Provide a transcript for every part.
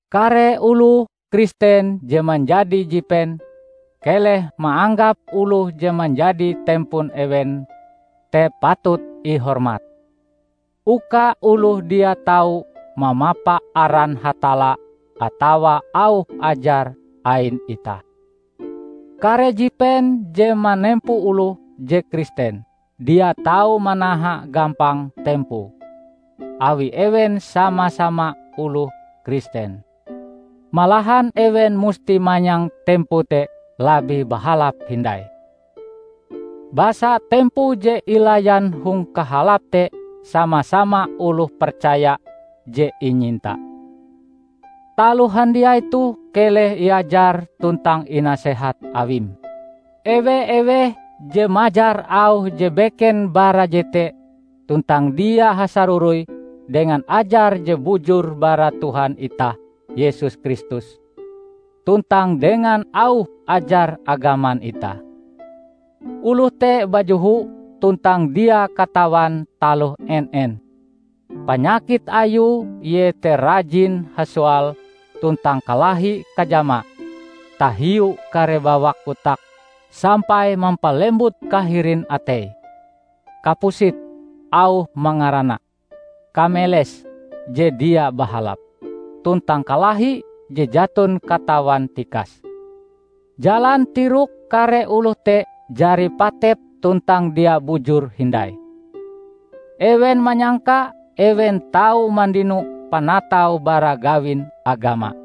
Kare oloh Kristen je manjadi jipen, keleh maanggap oloh je manjadi tempon ewen te patut ihormat, uka oloh dia tau mamapa aran Hatalla atawa auh ajar ain itah. Kare jipen je manempo oloh je Kristen, dia tau manaha gampang tempoe, awi ewen sama-sama oloh Kristen. Malahan ewen musti manyang tempoe te labih bahalap hindai, basa tempoe je ilayan hong kahalap te sama-sama oloh percaya je inyinta. Taloh handiai toh keleh iajar tuntang inasehat awim. Ewe-eweh je majar auh je beken bara jete tuntang dia hasaroroi dengan ajar je bujur bara Tuhan itah Yesus Kristus, tuntang dengan auh ajar agaman itah, oloh te bajoho tuntang dia katawan taloh en-en! Panyakit ayue iete rajin hasoal tuntang kalahi-kajama tahiu kare bawak kotak sampai mampalembut kahirin atei, kapusit, auh mangarana, kameles je dia bahalap, tuntang kalahi je jaton katawan tikase. Jalan tirok kare oloh te jari patep tuntang dia bujur hindai. Ewen manyangka ewen tau mandino panatau bara gawin agama.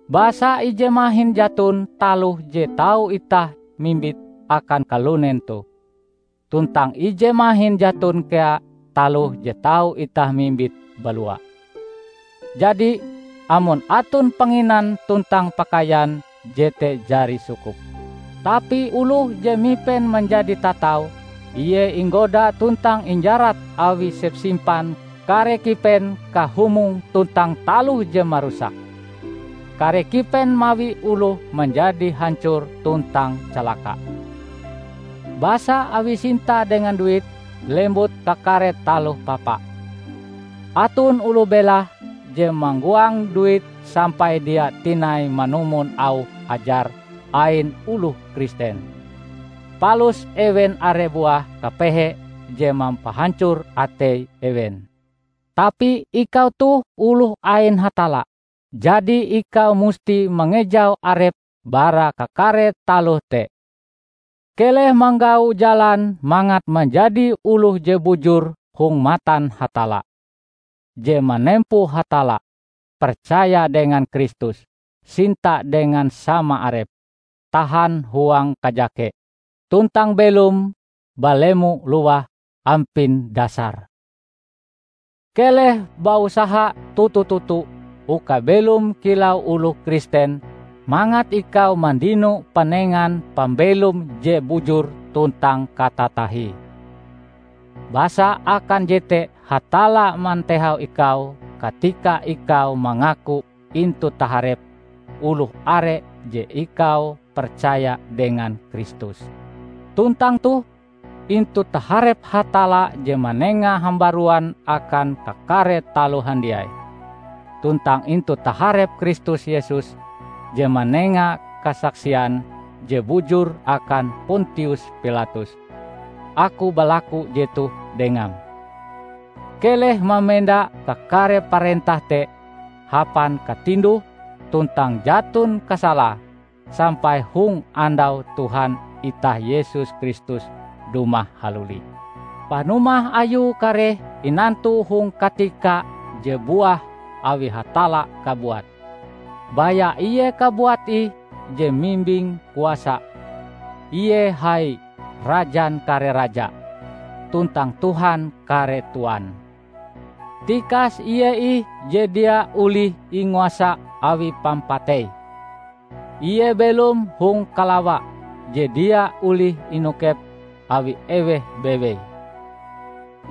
Basa ije mahin jaton taloh je tau itah mimbite akan kalunen toh, tuntang ije mahin jaton kea taloh je tau itah mimbite balua! Jadi, amon aton panginan tuntang pakaian, jete jari sukup. Tapi oloh je mipen manjadi tatau, ie inggoda tuntang injarat awi sepsimpan kare kipen kahumong tuntang taloh je marusak. Kare kipen mawi oloh manjadi hancor tuntang calaka. Basa awi sinta dengan duit, lembut kakare taloh papa. Aton oloh belahe je manggoang duit sampai dia tinai manumon auh ajar ain oloh Kristen, palus ewen are buah kapehe je mampahancor atei ewen. Tapi ikau toh oloh ain Hatalla, jadi ikau musti mangejau arepm bara kakare taloh te. Keleh manggau jalan mangat manjadi oloh je bujur hong matan Hatalla, je manempo Hatalla, percaya dengan Kristus, sinta dengan sama arepe, tahan huang kajake, tuntang belom balemo-lowah ampin dasare. Keleh bausaha toto-toto uka belom kilau oloh Kristen mangat ikau mandino panengan pambelom je bujur tuntang katatahie. Basa akan jete Hatalla mantehau ikau katika ikau mangaku intu taharep oloh are je ikau percaya dengan Kristus. Tuntang toh, intu taharep Hatalla je manenga hambaruan akan kakare taloh handiai, tuntang intu taharep Kristus Yesus je manenga kasaksian je bujur akan Pontius Pilatus, aku balaku jetoh dengam: Keleh mamenda kakare parentah te hapan katinduh tuntang jaton kasalae sampai hong andau Tuhan itah Yesus Kristus dumah haluli. Panumah Ayue kareh inantu hong katika je buah awi Hatalla kabuat. Baya Ie kabuat ih je mimbing kuasa; Ie hai, Rajan kare raja, tuntang Tuhan kare tuan. Tikas Ie ih je dia olih inguasa awi pampatei; Ie belom hong kalawa je dia olih inokep awi eweh bawei.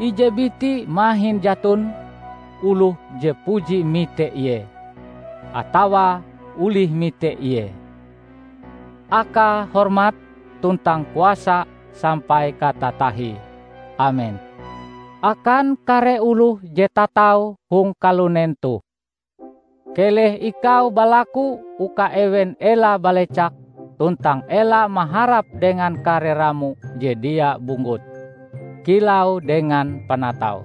Ije biti mahin jaton oloh je puji mite Ie, atawa olih mite Ie. Akae hormat tuntang kuasa sampai katatahie! Amen. Akan kare oloh je tatau hong kalunen toh, keleh ikau balaku uka ewen ela balecak tuntang ela maharap dengan kare ramo je dia bunggut -- kilau dengan panatau.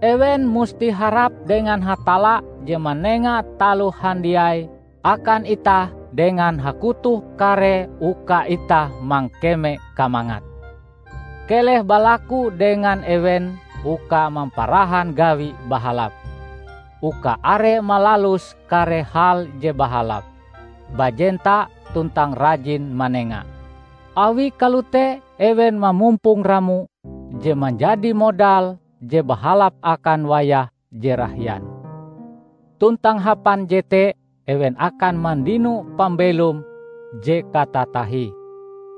Ewen musti harap dengan Hatalla je manenga taloh handiai akan itah dengan hakutoh karee uka itah mangkeme kamangate. Keleh balaku dengan ewen uka mamparahan gawi bahalap, uka are malalus kare hal je bahalap, bajenta tuntang rajin manenga. Awi kalote ewen mamumpong ramo je manjadi modal je bahalap akan wayah je rahian. Tuntang hapan jete ewen akan mandino pambelom je katatahie,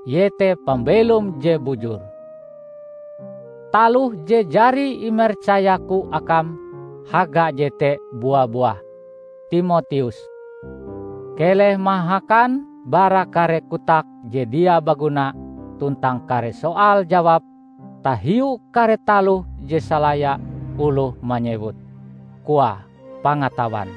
iete pambelom je bujur. Taloh je jari imercayaku akam, haga jete bua-buah, Timoteus! Keleh mahakan bara kare kotak je dia baguna tuntang kare soal-jawab tahiu kare taloh je salaya oloh manyewute, koae, "Pangatawan".